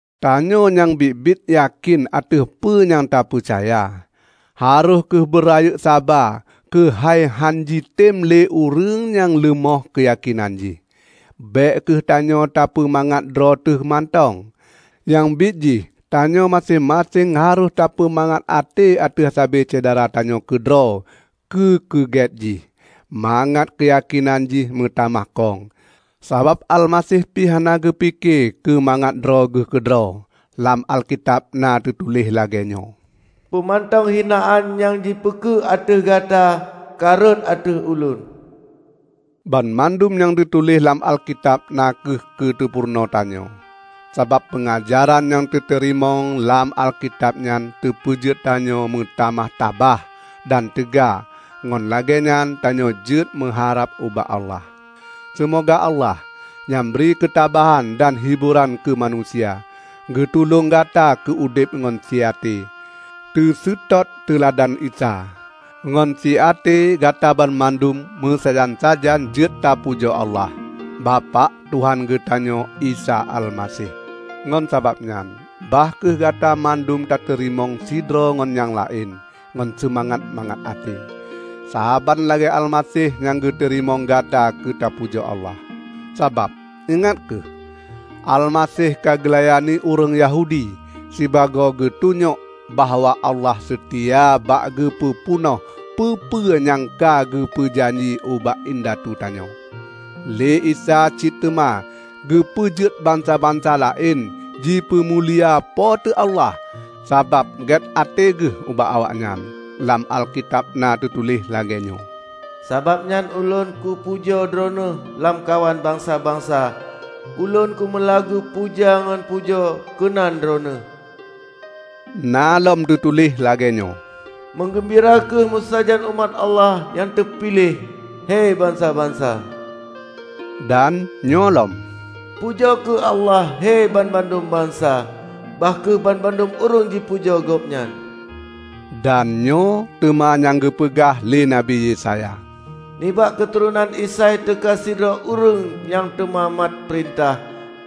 Tanyoe nyang biet-biet yakén ateueh peue nyang tapeucaya, harôh kheueh beurayeuk saba keuhai hánjitem lé ureuëng nyang leumoh keuyakénan jih. Bék kheueh tanyoe tapeumangat droe teuh mantong. Nyang biet jih tanyoe maséng-maséng harôh tapeumangat até ateueh sabe syedara tanyoe keudroe keu keugét jih, mangat keuyakénan jih meutamah kong. Sabab Almaseh pih hana geupike keumangat droegeuh keudroe. Lam Alkitab na teutuléh lagée nyoe, "Peue mantong hinaan nyang jipeukeue ateueh Gata ka rhot ateueh ulôn." Banmandum nyang na teutuléh lam Alkitab na kheueh keu teupurunoe tanyoe. Sabab peungajaran nyang tateurimong lam Alkitab nyan teupeujeuet tanyoe meutamah tabah dan teuga ngon lagée nyan tanyoe jeuet meuharab ubak Allah. Seumoga Allah, nyang bri keutabahan dan hiboran keumanusia, geutulông gata keu udeb ngon si até, teuseutôt teuladan Isa. Ngon si até Gata banmandum meusajan-sajan jeuet tapujoe Allah, Bapak Tuhan geutanyoe Isa Almaseh. Ngon sabab nyan bah kheueh Gata mandum tateurimong sidroe ngon nyang laén ngon seumangat mangat até, saban lagée Almaseh nyang geuteurimong gata keu teupujoe Allah. Sabab, ingat kheueh, Almaseh ka geulayani ureuëng Yahudi sibagoe geutunyok bahwa Allah seutia bak geupeu peunoh peue-peue nyang ka geupeue janji ubak indatu tanyoe. Lé Isa cit teuma geupeujeuet bansa-bansa laén jipeumulia Po teu Allah sabab gét até geuh ubak awaknyan. Lam Alkitab na teutuléh lagée nyoe, "Sabab nyan ulôn kupajoe Droeneueh lamkawan bansa-bansa, ulôn kumeulagu puja ngon pujoe keunan Droeneueh." Na lom teutuléh lagée nyoe, "Meugeumbira kheueh meusajan umat Allah nyang teupiléh, he bansa-bansa!" Dan nyoe lom, "Pujoe kheueh Allah, he banmandum bansa, bah kheueh banmandum ureuëng jipujoe Gobnyan!" Dan nyoe teuma nyang geupeugah lé Nabi Yesaya, "Nibak keuturonan Isai teuka sidroe ureuëng nyang teuma mat peurintah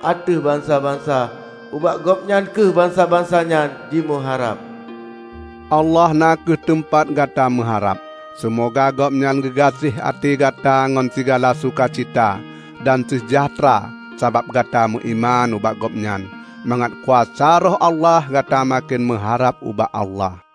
ateueh bansa-bansa; ubak Gobnyan kheueh bansa-bansa nyan jimeuharab." Allah na kheueh teumpat gata meuharab. Seumoga Gobnyan geugaséh até gata ngon sigala suka cita dan seujahteura sabab gata meuiman ubak Gobnyan, mangat kuasa Roh Allah gata maken meuharab ubak Allah.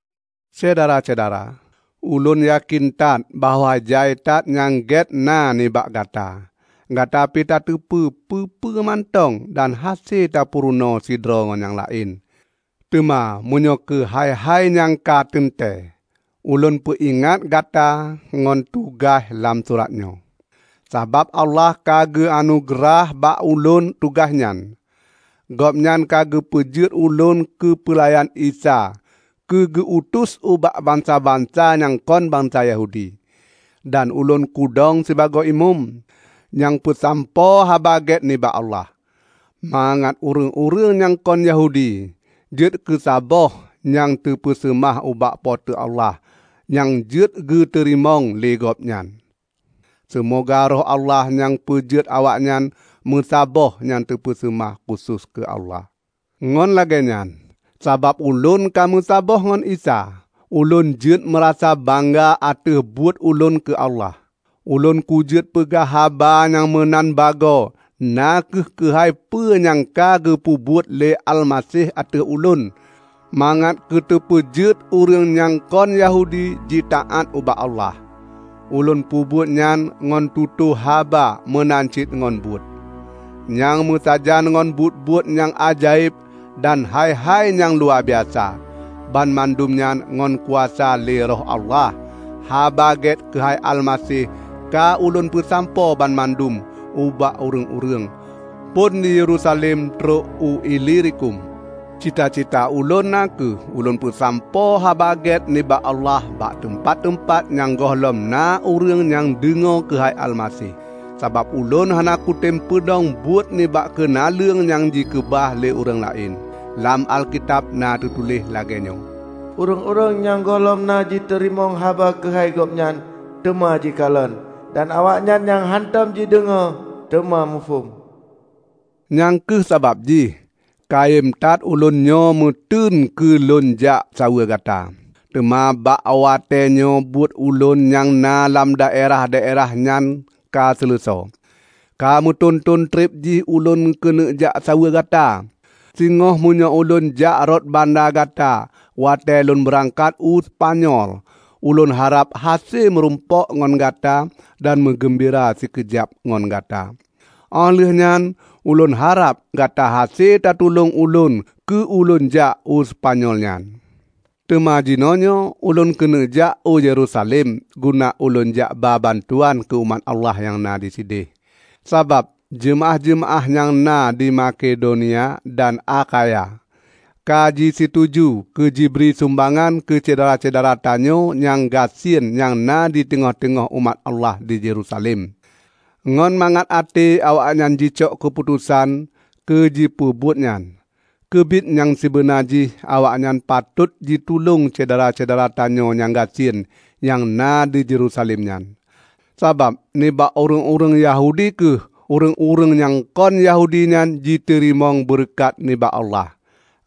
Syedara-syedara! Ulôn yakén that bahwa jai that nyang gét na nibak gata. Gata pih tateupeue peue-peue mantong dan hase tapeurunoe sidroe ngon nyang laén. Teuma meunyoe keuhai-hai nyang ka teuntée, ulôn peuingat gata ngon teugaih lam surat nyoe, sabab Allah ka geu anugeurah bak ulôn tugaih nyan. Gobnyan ka geupeujeuet ulôn keupeulayan Isa keu geu-utus ubak bansa-bansa nyang kon bansa Yahudi. Dan ulôn kudong sibagoe imeum, nyang peusampoe Haba Gét nibak Allah, mangat ureuëng-ureuëng nyang kon Yahudi jeuet keusaboh nyang teupeuseumah ubak Po teu Allah nyang jeuet geuteurimong lé Gobnyan. Seumoga Roh Allah nyang peujeuet awaknyan meusaboh nyang teupeuseumah khusos keu Allah. Ngon lagée nyan, sabab ulôn ka meusaboh ngon Isa, ulôn jeuet meurasa bangga ateueh buet ulôn keu Allah. Ulôn kujeuet peugah haba nyang meunan bagoe na kheueh keuhai peue nyang ka geupeubuet lé Almaseh ateueh ulôn mangat keuteupeujeuet ureuëng nyang kon Yahudi jitaát ubak Allah. Ulôn peubuet nyan ngon tutoe haba meunan cit ngon buet, nyang meusajan ngon buet-buet nyang ajaéb dan hai-hai nyang luwabiasa; banmandum nyan ngon kuasa lé Roh Allah. Haba Gét keuhai Almaseh ka ulôn peusampoe banmandum ubak ureuëng-ureuëng, phon di Yerusalem trok u Ilirikum. Cita-cita ulôn na kheueh ulôn peusampoe Haba Gét nibak Allah bak teumpat-teumpat nyang gohlom na ureuëng nyang deungoe keuhai Almaseh. Sabab ulôn hana kutem peudong buet nibak keunaleueng nyang jikeubah lé ureuëng laén. Lam Alkitab na teutuléh lagée nyoe, "Ureuëng-ureuëng nyang gohlom na jiteurimong haba keuhai Gobnyan, teuma jikalon; dan awaknyan nyang hántom jideungoe teuma muphom." Nyang kheueh sabab jih ka kayém that ulôn nyoe meuteun keu lôn jak saweue gata. Teuma bak watée nyoe buet ulôn nyang na lam daerah-daerah nyan ka seuleusoe. Ka meuthon-thon treb jih ulôn keuneuk jak saweue gata. Singoh meunyoe ulôn jak rot banda gata watée lôn beurangkat u Seupanyol, ulôn harab hase meurumpok ngon gata dan meugeumbira sikeujab ngon gata. Óh lheueh nyan ulôn harab gata hase tatulông ulôn keu ulôn jak u Seupanyol nyan. Teuma jinoenyoe ulôn keuneuk jak u Yerusalem guna ulôn jak ba bantuan keu umat Allah nyang na disideh. Sabab jeumaáh-jeumaáh nyang na di Makedonia dan Akhaya ka jisituju keujibri sumbangan keu syedara-syedara tanyoe nyang gasien nyang na diteungoh-teungoh umat Allah di Yerusalem. Ngon mangat até awaknyan jicok keuputosan keu jipeubuet nyan. Keubiet nyang sibeuna jih awaknyan patot jitulông syedara-syedara tanyoe nyang gasien nyang na di Yerusalem nyan; sabab nibak ureuëng-ureuëng Yahudi kheueh ureuëng-ureuëng nyang kon Yahudi nyan jiteurimong beureukat nibak Allah.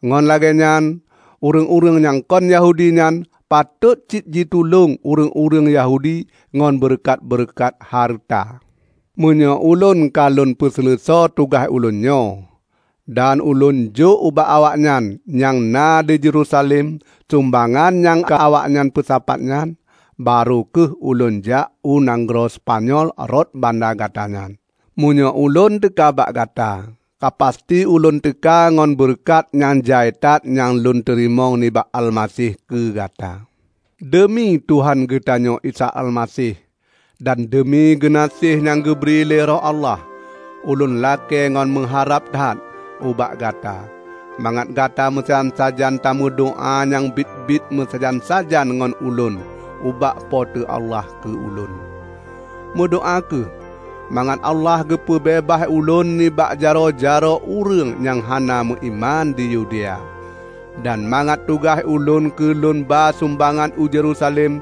Ngon lagée nyan, ureuëng-ureuëng nyang kon Yahudi nyan patot cit jitulông ureuëng-ureuëng Yahudi ngon beureukat-beureukat hareuta. Meunyoe ulôn ka lôn peuseuleusoe tugaih ulôn nyoe, dan ulôn jôk ubak awaknyan nyang na di Yerusalem sumbangan nyang ka awaknyan peusapat nyan, barô kheueh ulôn jak u nanggroe Seupanyol rot banda gata nyan. Meunyoe ulôn teuka bak gata, ka pasti ulôn teuka ngon beureukat nyang jai that nyang lôn teurimong nibak Almaseh keu gata. Deumi Tuhan geutanyoe Isa Almaseh, dan deumi geunaséh nyang geubri lé Roh Allah, ulôn lakée ngon meuharab that ubak gata, mangat gata meusajan-sajan tameudoá nyang biet-biet meusajan-sajan ngon ulôn ubak Po teu Allah keu ulôn. Meudoá kheueh mangat Allah geupeu beubaih ulôn nibak jaroe-jaroe ureuëng nyang hana meuiman di Yudea, dan mangat tugaih ulôn keu lôn ba sumbangan u Yerusalem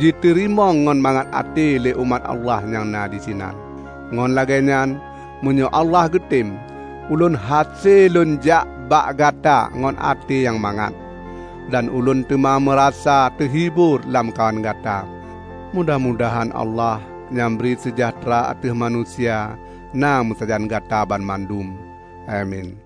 jiteurimong ngon mangat até lé umat Allah nyang na disinan. Ngon lagée nyan, meunyoe Allah geutem, ulôn hase lôn jak bak gata ngon até nyang mangat. Dan ulôn teuma meurasa teuhibor lamkawan gata. Mudah-mudahan Allah, nyang bri seujahteura ateueh manusia, na meusajan gata banmandum. Amin.